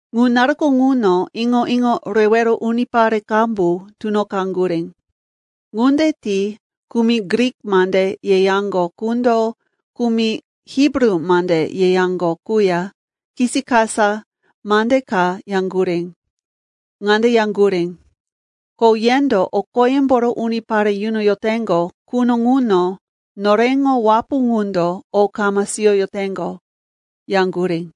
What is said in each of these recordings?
Ŋu naruko ŋuno iŋo-iŋo rewero unipare qambu tunoqaŋgurí. Ŋunde ti kumi Grik mande yeyaŋgo qundo kumi Hibru mande yeyaŋgo quya kisikasa mande ka yaŋgurí. Ŋande yaŋgurí, “Ko yendo o qoyemboro unipare yunoyoteŋgo quno ŋuno noreŋo wapu ŋundo o kama siyoyoteŋgo,” yaŋgurí.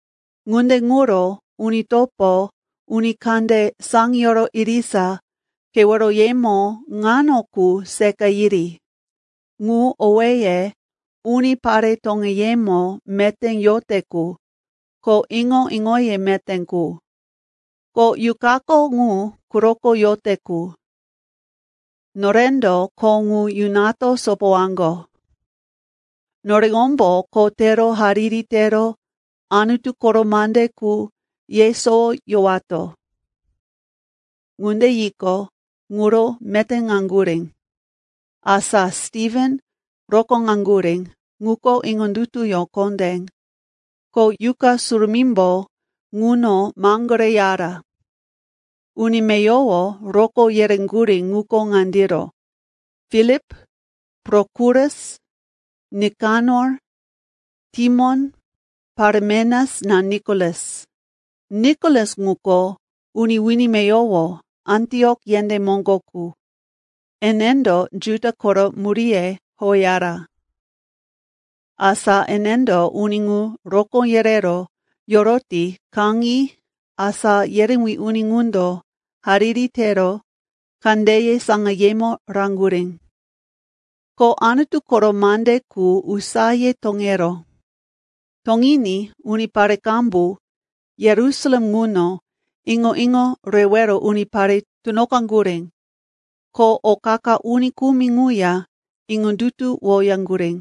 Ŋunde ŋuro, uni topo, uni kande saŋiyoro irisa keweroyemo ŋano qu seqa yiri, ŋu owéye unipare toŋeyemo meté yote qu, ko iŋo-iŋoye meté qu, ko Yuqako ŋu quroko yote qu. Norendo kho ŋu yunato sopowaŋgo. Noreŋombo kho tero hariri tero Anutu koro mande qu yesowoyowato.” Ŋunde yiqo, ŋuro metéŋaŋgurí. Asa Stiven rokóŋaŋgurí, ŋuko iŋondutuyó kondé, ko Yuqa Surumímbo ŋuno maŋgoreyara. Uni meyowo rokó yereŋgurí ŋuko ŋandiro: Filip, Prokorus, Nikanor, Timon, Paremenas ko Nikolas. Nikolas ŋuko uni wini meyowo Antiok yendé moŋgo qu, enendo Juda koro muríye howeyara. Asa enendo uni ŋu rokó yerero yoroti kaŋi asá yerewí uni ŋundo hariri tero kandeye saŋayemo raŋgurí. Ko Anutu koro mande qu usaye toŋeró. Toŋiní unipare qambu Yerusalem ŋuno iŋo-iŋo rewero unipare tunoqaŋgurí. Ko o qa-qa uni kumi ŋuya iŋondutuwoyaŋgurí.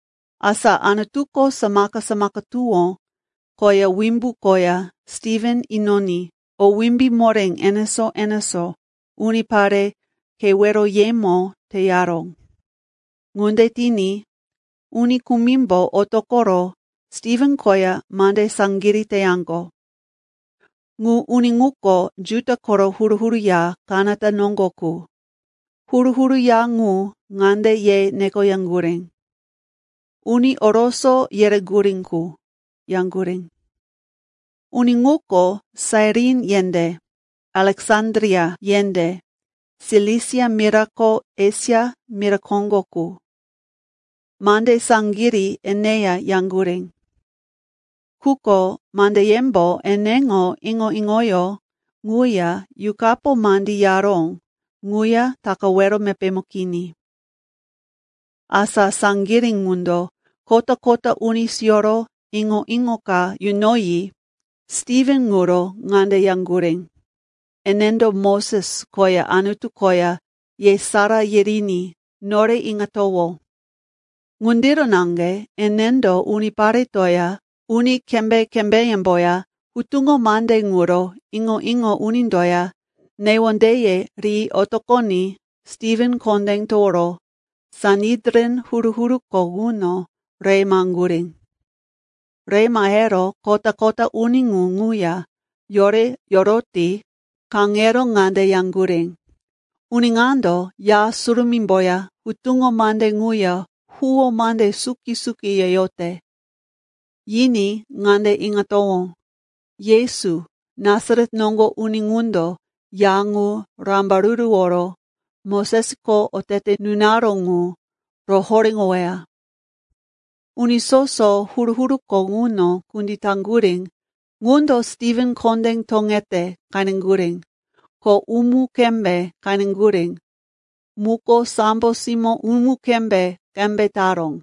Asa Anutuko samaka-samaka tuwó koya wimbu koya Stiven inoní o wimbí moré enesó-enesó unipare keweroyemo teyaró. Ŋunde tiní uni kumimbo otoqoro Stiven koya mande saŋgirí teyaŋgo. Ŋu uni ŋuko Juda koro huru-huru ya kanata noŋgo qu, huru-huru ya ŋu ŋande ye nekoyaŋgurí, “Uni Oroso yereŋgurí qu,” yaŋgurí. Uni ŋuko Sairin yendé, Aleksandria yendé, Silisia mira ko Esia mira koŋgo qu. Mande saŋgirí eneya yaŋgurí, quko mandeyembo eneŋo iŋo-iŋoyó ŋuya Yuqapo mandí yaró ŋuya takawero mepémo kini. Asa saŋgirí ŋundo kota-kota uni siyoro iŋo-iŋo ka yunoyi Stiven ŋuro ŋande yaŋgurí, “Enendo Moses koya Anutu koya yesará yiriní nore iŋatowó.” Ŋundiro naŋge enendo uniparetoya uni kembé-kembéyemboya hutuŋo mande ŋuro iŋo-iŋo unindoya newondeye ri otoqoní Stiven kondé toworo Sanedrin huru-huruko ŋuno re maheŋgurí. Re mahero kota-kota uni ŋu ŋuya yore yoroti kaŋero ŋande yaŋgurí, “Uni ŋando Ya Surumímboya hutuŋo mande ŋuya huwó mande suki-suki yeyote. Yiní ŋande iŋatowó, ‘Yesu, Nasaret noŋgo uni ŋundo ya ŋu rambaruruworo Mosesko otete nunaró ŋu rohoréŋoweya.’” Uni soso huru-huruko ŋuno kunditaŋgurí ŋundo Stiven kondé toŋete qeneŋgurí, ko umu-kembé qeneŋgurí muko sambo simó umu-kembé qembe taró.